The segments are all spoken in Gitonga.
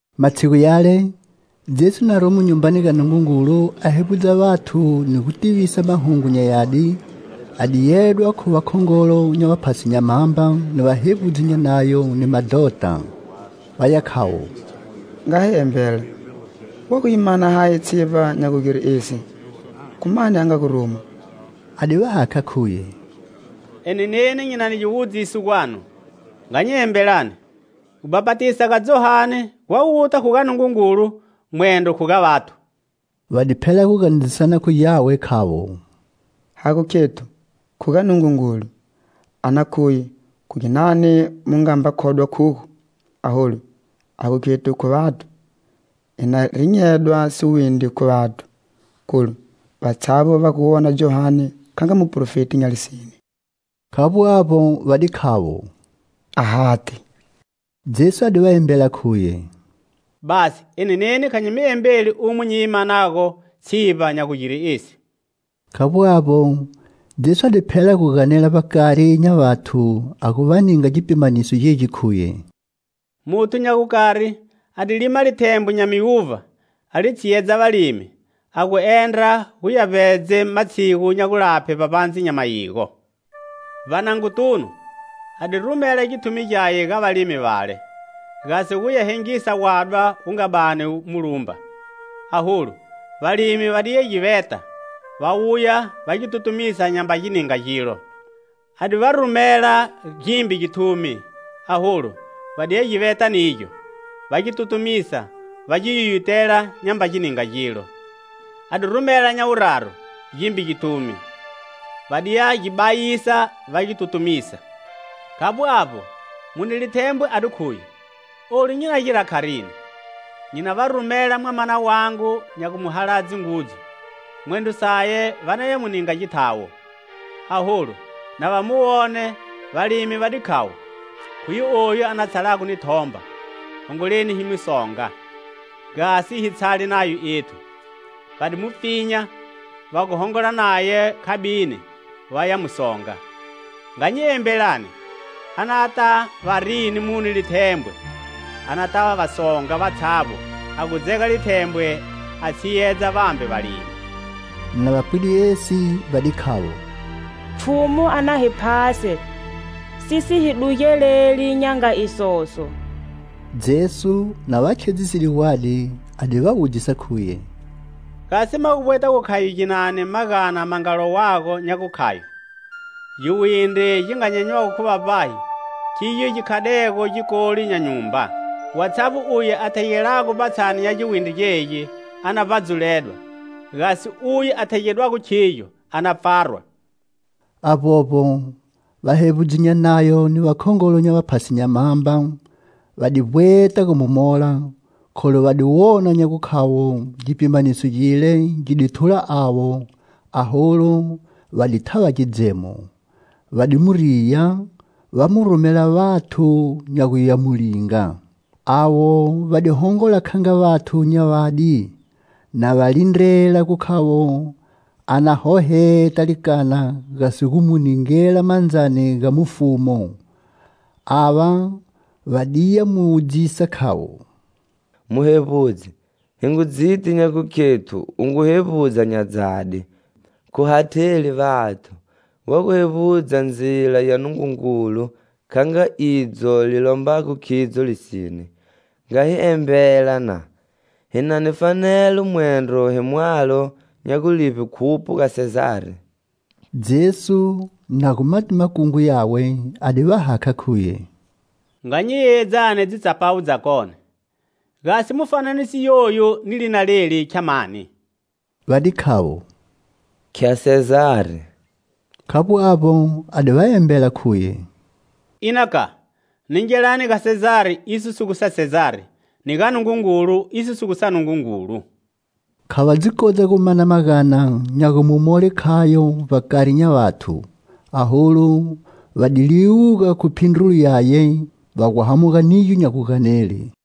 Matshigu yale, Jesu na romo Nyumbani ga Nungungulu a hevbudza vathu ni gu tivisa Mahungu nya Yadi, a di yedwa khu vakhongolo nya vaphasi nya mhamba ni vahevbudzi nya Nayo ni madhota. Vaya khavo: "Nga hi embela: wa gu yi mana hayi tshivba nya gu gire esi? Khu mani a nga gu ruma?" A di va hakha, khuye: "Eni neni nyi na ni giwudziso gwanu. Nga nyi embelani: gubhapatisa ga Johane gwa guta khu ga Nungungulu, mwendro khu ga vathu?" Va di phela gu ganedzisana khu gyawe, khavo: "Ha gu khethu: Khu ga Nungungulu, a na khuye khu ginani mu nga mba khodwa khugo? Aholu ha gu khethu khu vathu, hi na rinyedwa siwindri khu vathu, kholu vatshavbo va gu wona Johane kha nga muprofeti nya lisine." Khavbo avbo, va di khavo: "Ahati." Jesu a di va embela, khuye: "Basi. Eni neni kha nyi mi embeli umo nyi yi manago tshivba nya gu gira esi." Khavbo avbo, Jesu a di phela gu ganela vbakari nya vathu, a gu va ninga gipimaniso gegi khuye: "Muthu nya gukari a di lima lithembwe nya miuvha, a li tshiyedza valimi, a gu endra nya gu ya vbedze matshigu nya gulaphe, vbavbandze nya mayigo. Vbanangotunu, a di rumela githumi gyaye ga valimi vale, gasi guya hengisa wadwa wu nga bani wu mu lumba. Aholu valimi va diya gi veta va wuya va gi tutumisa nyamba gi ninga gilo. A di va rumela gimbe githumi, aholu va diya gi veta nigyo, va gi tutumisa, va gi yuyutela nyamba gi ninga gilo. A di rumela nya wuraru gimbe githumi. Va diya gi bayisa, va gi tutumisa. Khavbo avbo, mune lithembwe a di khuye: 'Olu nyi na gira kharini? Nyi na va rumela mwamana wangu nya gu mu haladze ngudzu, mwendro saye va naya mu ninga githawo.' Aholu, na va mu wone, valimi va di, khavo: 'Khuye oyu a na tshalago ni thomba. Hongoleni hi mu songa, gasi hi tshale nayo ethu.' Va di mu pfinya, va gu hongola naye khabini vaya mu songa. Nga nyi embelani, anata va rini mune lithembwe? Anata va songa vatshavbo, a gu dzega lithembwe a tshiyedza vambe valimi." Na va pwide esi, va di khavo: "Pfhumu a na hi phase, si si hi dugeleli nya nga isoso!" Jesu, na va khedziside gwadi, a di va wudzisa, khuye: "Gasi ma gu vbweta gu khayo ginani magana ma nga lowago, nya gu khayo: 'Giwindri gi nga nyenywago khu vavbahi khigyo gi khadego gikoli nya nyumba?' Watshavbo uye a thegelago vbatshani nya giwindri gegi a na vbadzuledwa; gasi uye a thegedwago khigyo a na pfarwa." Avbovbo, vahevbudzi nya Nayo ni vakhongolo nya vaphasi nya mhamba va di vbweta gu mu mola, kholu va di wona nya gu khavbo gipimaniso gile gi di thula avo, aholu va di thava gidzemo. Va di mu riya, va mu rumela vathu nya gu ya mu linga. Avo va di hongola kha nga vathu nya vadi, na va lindrela gu khavo a na hoheta likana, gasi gu mu ningela mandzani ga mufumu. Ava va diya mu wudzisa, khavo: "Muhevbudzi, hi ngu dziti nya gukhethu u ngu hevbudza nya dzadi, khu hatheli vathu; wa gu hevbudza ndzila ya Nungungulu kha nga idzo li lombago khidzo lisine. Nga hi embela, na. Hi na ni fanelo mwendro hi mwalo nya gu livbe khupho ga Sezari?" Jesu, na gu ma ti makungu yawe, a di va hakha, khuye: "Nga nyi yeyedzani dzitsapawu dzakone. Gasi mufananiso yoyu ni lina leli khya mani?" Va di khavo: "Khya Sezari." Khavbo avbo, a di va embela, khuye: "Ina, ka, ningelani ga Sezari iso si gu sa Sezari, ni ga Nungungulu iso si gu sa Nungungulu." Kha va dzi kodza gu mana magana nya gu mu mole khayo vbakari nya vathu, aholu va di liwuga khu phindrulo yaye, va gu hamuga nigyo nya guganele.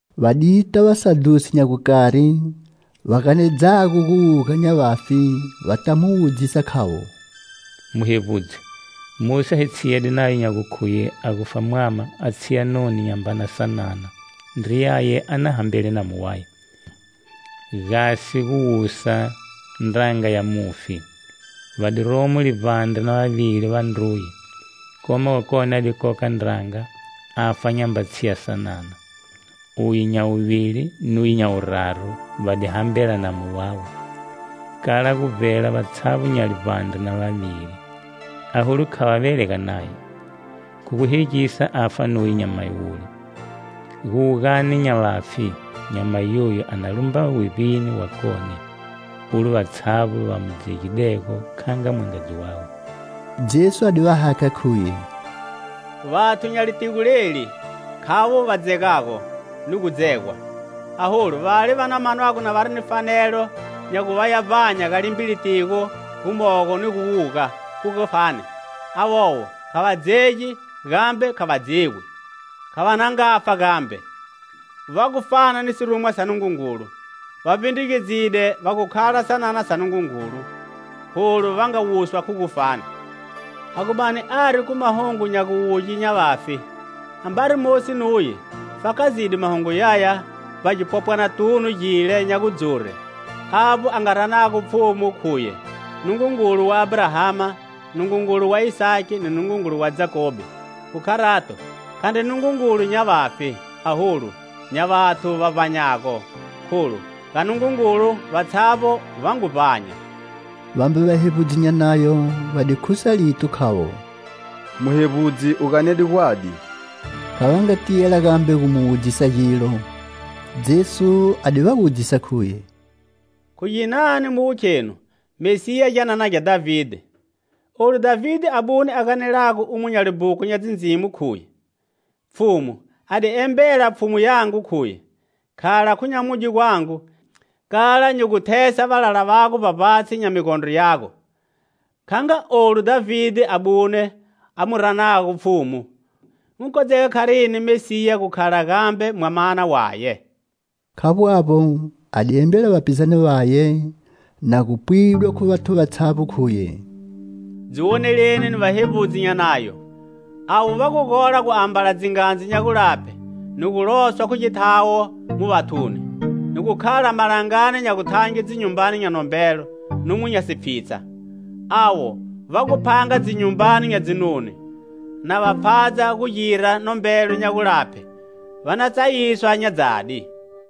Va dita vasadhusi nya gukari, va ganedzago gu wuga nya vafi, vata mu wudzisa, khavo: "Muhevbudzi, Mosi a hi tshiyede nayo nya gukhuye a gufa mwama, a tshiya noni nya mbana sanana, ndriyaye a na hambele namu waye, gasi gu wusa ndranga ya mufi. Va di romo livbandre na vavili vandruye. Koma wakone a di koka ndranga, a fa nyamba tshiya sanana. Uye nya wuvili nuye nya wuraru va di hambela namu wawe, kala gu vbela vatshavbo nya livbandre na vavili, aholu kha va velega naye. Khu gu hegisa afa nuye nyamayi wule. Guwugani nya vafi, nyamayi yoyu a na lumba wevbini wakone, ulo vatshavbo va mu dzegidego kha nga mwangadzi wawe?" Jesu a di va hakha, khuye: "Vathu nya litigo leli khavo va dzegago ni gu dzegwa. Aholu vale va na manwago vari ni fanelo nya gu ya vbanya ga limbe litigo gumogo ni gu wuga khu gufani, avovo kha va dzegi gambe kha va dzegwi. Kha va na ngafa gambe. Va gu fana ni sirumwa sa Nungungulu. Va vbindrugedzide va gu khala sanana sa Nungungulu. Kholu va nga wuswa khu gufani. A gu bani ari khu mahungu nya guwuge nya vafi, ambari Mosi nuye fakazide mahungu yaya vbagipopwanatunu gile nya gu dzure, avbo a nga ranago Pfhumu khuye Nungungulu wa Abrahama, Nungungulu wa Isaki ni Nungungulu wa Jakobe. Khu kharato, khandri Nungungulu nya vafi, aholu, nya vathu va vbanyago. Kholu ga Nungungulu vatshavbo va ngu vbanya." Vambe vahevbudzi nya Nayo va di khusa lito, khavo: "Muhevbudzi, u ganede gwadi." Kha va nga tiyela gambe gu mu wudzisa gilo. Jesu a di va wudzisa, khuye: "Khu ginani mu gu khenu Mesiya gyanana gya Dhavide? Olu Dhavide abune a ganelago u mo nya libhuku nya Dzindzimo, khuye: 'Pfhumu a di embela Pfhumu yangu, khuye: Khala khu nyamudye gwangu, kala nyi gu thesa valala vago vbavbatshi nya migondro yago' Kha nga olu Dhavide abune a mu ranago Pfhumu, gu ngu kodzega kharini Mesiya gu khala gambe mwamana waye?" Khavbo avbo, a di embela vapizane vaye, na gu pwidwa khu vathu vatshavbo, khuye: "Dzi woneleni ni vahevbudzi nya Nayo. Avo va gu gola gu ambala dzingadzu nya gulaphe ni gu loswa khu githawo mu vathuni, ni gu khala malangani nya guthange dzinyumbani nya nombelo numo nya sipfhitsha. Avo va gu phanga dzinyumbani nya dzinoni, na va pfhadza gu gira nombelo nya gulaphe. Va na tsayiswa nya dzadi."